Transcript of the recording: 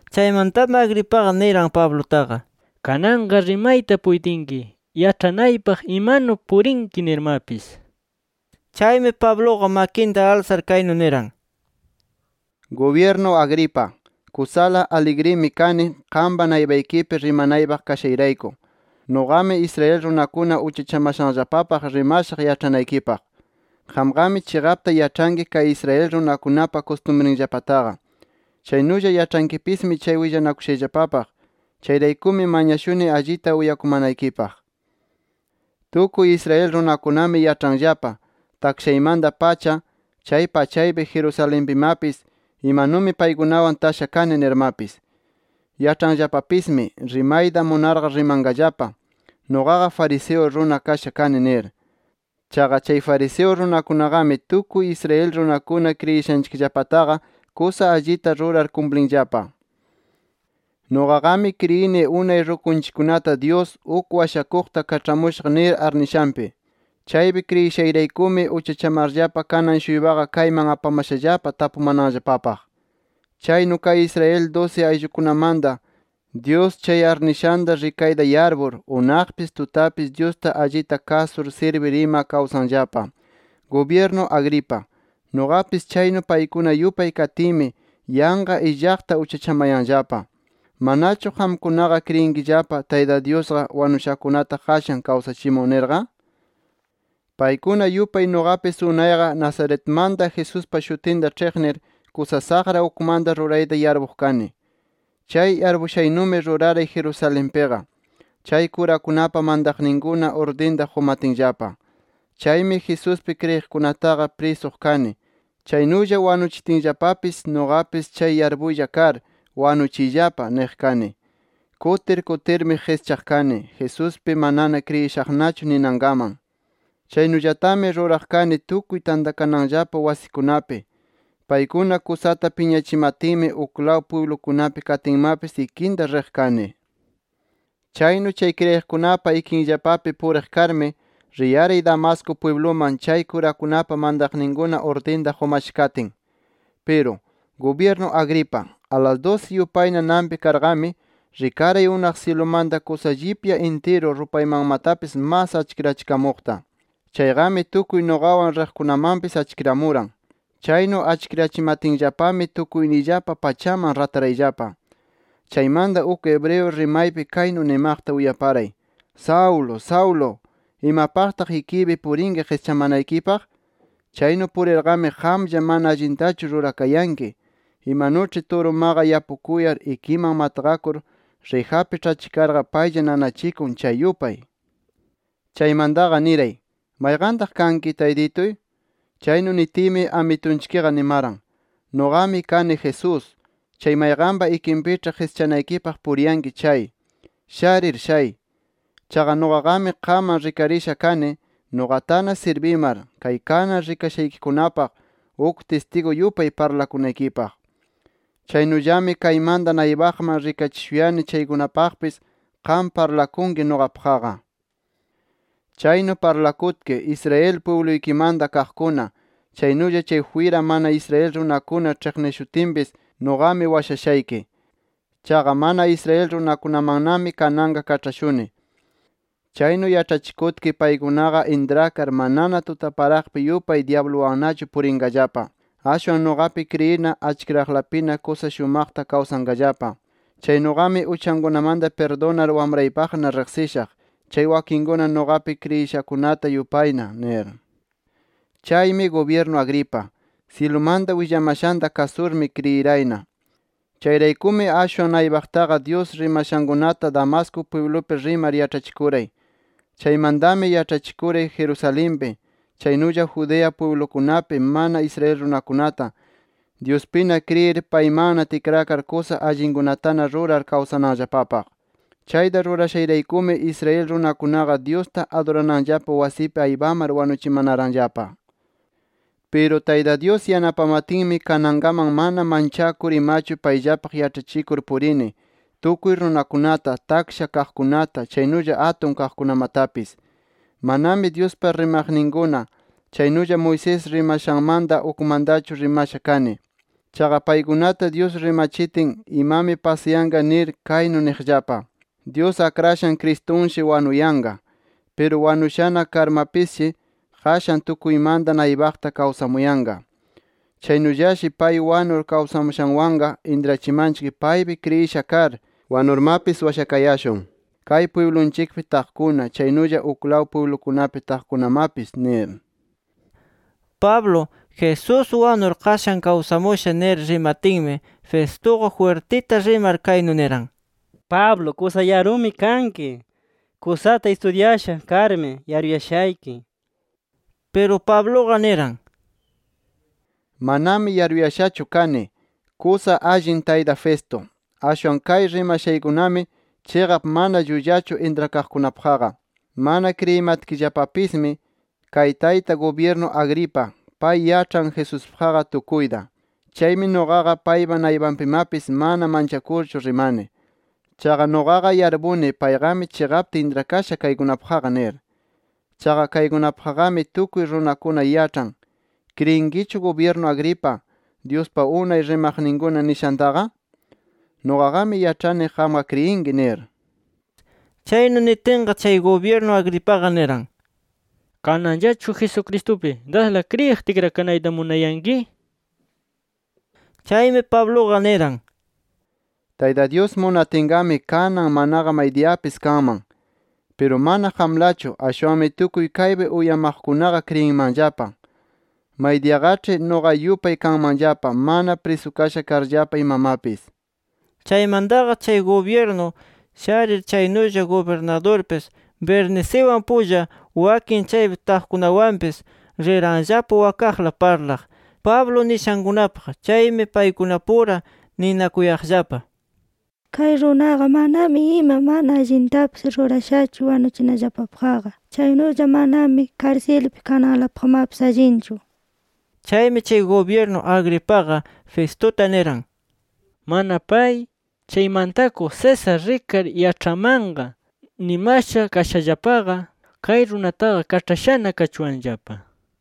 Chaymantami Agripaqa niran Pablutaqa: —Kananqa rimayta puytinki yaĉhanaypaq imanu purinki nirmapis. Chaymi, Pabluqa makinta alsar kaynu niran: —Gubyirnu Agripa, kusala aligrimi kani, qampa naypaykipi rimanaypaq kashayrayku. Nuqami Israel runakuna uchachamashanllapapaq rimashaq yaĉhanaykipaq. Qamqami chiqapta yaĉhanki kay Israel runakunapa kustumriyllapataqa. Chaynulla yaĉhankipismi chay willanakushayllapapaq. Chayraykumi mañashuni allita uyakumanaykipaq. “Tukuy Israel runakunami yaĉhanllapa, takshaymanta-pacha chay pachaypi, Jerusalenpimapis, imanumi paykunawan tasha kani nirmapis. Yaĉhanllapapismi, rimayta munarqa rimanqallapa, nuqaqa fariseo runa kasha kani nir. Chaqa chay fariseo runakunaqami tukuy Israel runakuna kriyishanchikllapataqa kusa allita rurar kumplinllapa. Nuqaqami kriyini unay rukunchikkunata, Dyus ‘Uk washakuqta kaĉhamushaq’ nir arnishanpi. Chaypi kriyishayraykumi uchachamarllapa kanan-shuypaqa kayman apamashallapa tapumananllapapaq. Chaynu kay Israel dusi ayllukunamanta, Dyus chay arnishanta rikayta yarpur, unaqpis tutapis Dyusta allita kasur sirbir ima kawsanllapa. Gubyirnu Agripa, nuqapis chaynu paykuna yupay katiymi, yanqa illaqta uchachamayanllapa. ¿Manachu qamkunaqa kriyinkillapa, Tayta Dyusqa wanushakunata qashan kawsachimun nirqa? “Paykuna yupay nuqapis unayqa Nazaretmanta Jesuspa shutinta ĉhiqnir, kusa saqra ukmanta rurayta yarpuq kani. Chay yarpushaynumi ruraray Jerusalenpiqa, chay kurakunapa mantaqninkuna urdinta qumatinllapa. Chaymi Jesuspi kriyiqkunataqa prisuq kani. Chaynulla wanuchitinllapapis nuqapis chay yarpuylla kar ‘Wanuchiyllapa’ niq kani. Kutir kutirmi qischaq kani, ‘Jesuspiqa manana kriyishaqnachu’ ninankaman. Chaynullatami ruraq kani tukuy tantakananllapa wasikunapi. Paykuna kusata piñachimatinmi, uklaw pwiblukunapi katinmapis ikinta riq kani. “Chaynu chay kriyiqkunapa ikinllapapi puriq karmi, riyaray Damasco pwibluman, chay kurakunapa mantaqninkuna urdinta qumasha katin. Piru, gubyirnu Agripa, alas dusi yupayna nanpi karqami, rikaray unaq syilumanta kusa llipya intiru, rupaymanmatapis masta achkirachikamuqta. Chayqami tukuy nuqawan riqkunamanpis achkiramuran. Chaynu achkirachimatinllapami tukuyniyllapa pachaman ratarayllapa. Chaymanta uk hebreo rimaypi, kaynu nimaqta uyaparay: ‘Saulo Saulo ¿imapaqtaq ikiypi purinki qischamanaykipaq? Chaynu purirqami qamlla mana allintachu rurakayanki, imanuĉhi turumaqa yapukuyar, ikiman matqakur, rijapi ĉhachikarqa paylla nanachikun chay yupay’. “Chaymantaqa niray: ‘¿Mayqantaq kanki, Taytituy?’ “Chaynu nitiymi Amitunchikqa nimaran: ‘Nuqami kani Jesús, chay mayqanpa ikinpiĉhi qischanaykipaq puriyanki chay. Sharir shay. Chaqa nuqaqami qamman rikarisha kani nuqatana sirbimar, kay kanan rikashaykikunapaq uk tistigu yupay parlakunaykipaq. Chaynullami kaymanta naypaqman rikachishuyani, chaykunapaqpis qam parlakunki nuqapaqqa. Chaynu parlakutki, Israel pwibluykimanta kaqkuna, chaynulla chay jwira mana Israel runakuna ĉhiqnishutinpis nuqami washashayki. Chaqa mana Israel runakunamannami kananqa kaĉhashuni. Chaynu yaĉhachikutki paykunaqa intrakar manana tutaparaqpi yupay dyabluwannachu purinqallapa. Ashwan nuqapi kriyirna, achkiraqlapina kusa shumaqta kawsanqallapa. Chaynuqami uchankunamanta pirdunar wamraypaqna riqsishaq, chay wakinkuna nuqapi kriyishakunata yupayna’ nir. “Chaymi gubyirnu Agripa, syilumanta willamashanta, kasurmi kriyirayna. Chayraykumi ashwan naypaqtaqa Dyus rimashankunata Damasco pwiblupi rimar yaĉhachikuray. Chaymantami yaĉhachikuray Jerusalenpi, chaynulla Judea pwiblukunapi, mana Israel runakunata, Dyuspina kriyir, paymanna tikrakar kusa allinkunatana rurar kawsananllapapaq. Chayta rurashayraykumi Israel runakunaqa Dyusta adurananllapa wasipi aypamar wanuchimanaranllapa. Piru Tayta Dyus yanapamatinmi, kanankaman mana manchakur imachu payllapaq yaĉhachikur purini, tukuy runakunata – taksha kaqkunata, chaynulla atun kaqkunamatapis. Manami Dyuspa rimaqninkuna, chaynulla Moisés rimashanmanta ukmantachu rimasha kani. Chaqa paykunata Dyus rimachitin, imami pasayanqa nir kaynu niqllapa: ‘Dyus Akrashan Cristunshi wanuyanqa. Piru wanushana karmapisshi, qashan tukuymanta naypaqta kawsamuyanqa. Chaynullashi pay wanur kawsamushanwanqa, intrachimanchik paypi kriyisha kar wanurmapis washakayashun, kay pwiblunchikpi taqkuna, chaynulla uklaw pwiblukunapi kaqkunamapis’ nir”. Pablo, Jesús wanur qashan kawsamusha nir rimatinmi, Festuqa jwirtita rimar kaynu niran: —¡Pablo kusa yarumi kanki! ¡Kusata istudyasha karmi yaruyashayki! nir. Piru Pabluqa niran: —Manami yaruyashachu kani. Kusa allin tayta Festo, ashwan kay rimashaykunami chiqap mana llullachu intrakaqkunapaqqa. Mana kriyimatkillapapismi, kay tayta gubyirnu Agripa, pay yaĉhan Jesuspaqqa tukuyta. Chaymi nuqaqa paypa naypanpimapis mana manchakurchu rimani. Chaqa nuqaqa yarpuni payqami chiqapta intrakasha kaykunapaqqa nir. Chaqa kaykunapaqqami tukuy runakuna yaĉhan. ¿Kriyinkichu gubyirnu Agripa, Dyuspa unay rimaqninkuna nishantaqa? Nuqaqami yaĉhani, qamqa kriyinki nir. Chaynu nitinqa, chay gubyirnu Agripaqa niran: —¿Kananllachu Jesucristupi dasla kriyiq tikrakanayta munayanki? nir. Chaymi Pabluqa niran: —Tayta Dyus munatinqami kanan, manaqa maydiyapis kanman. Piru mana qamlachu, ashwanmi tukuy kaypi uyamaqkunaqa kriyinmanllapa. Maydiyaqaĉhi nuqa yupay kanmanllapa, mana prisukasha karllapa imamapis. Chaymantaqa, chay gubyirnu sharir chaynulla gubirnadurpis, Berniciwan pulla, wakin chaypi taqkunawanpis, riranllapa wakaqla parlaq, Pablo nishankunapaq. Chaymi paykunapura ninakuyaqllapa: “Kay runaqa manami ima mana allintapis rurashachu wanuchinallapapaqqa. Chaynulla manami karsilpi kananlapaqmapis allinchu”. Chaymi chay gubyirnu Agripaqa, Festuta niran: —Mana pay, chay mantakuq César rikar yaĉhamanqa nimasha kashallapaqa, kay runataqa kaĉhashana kachuwanllapa nir.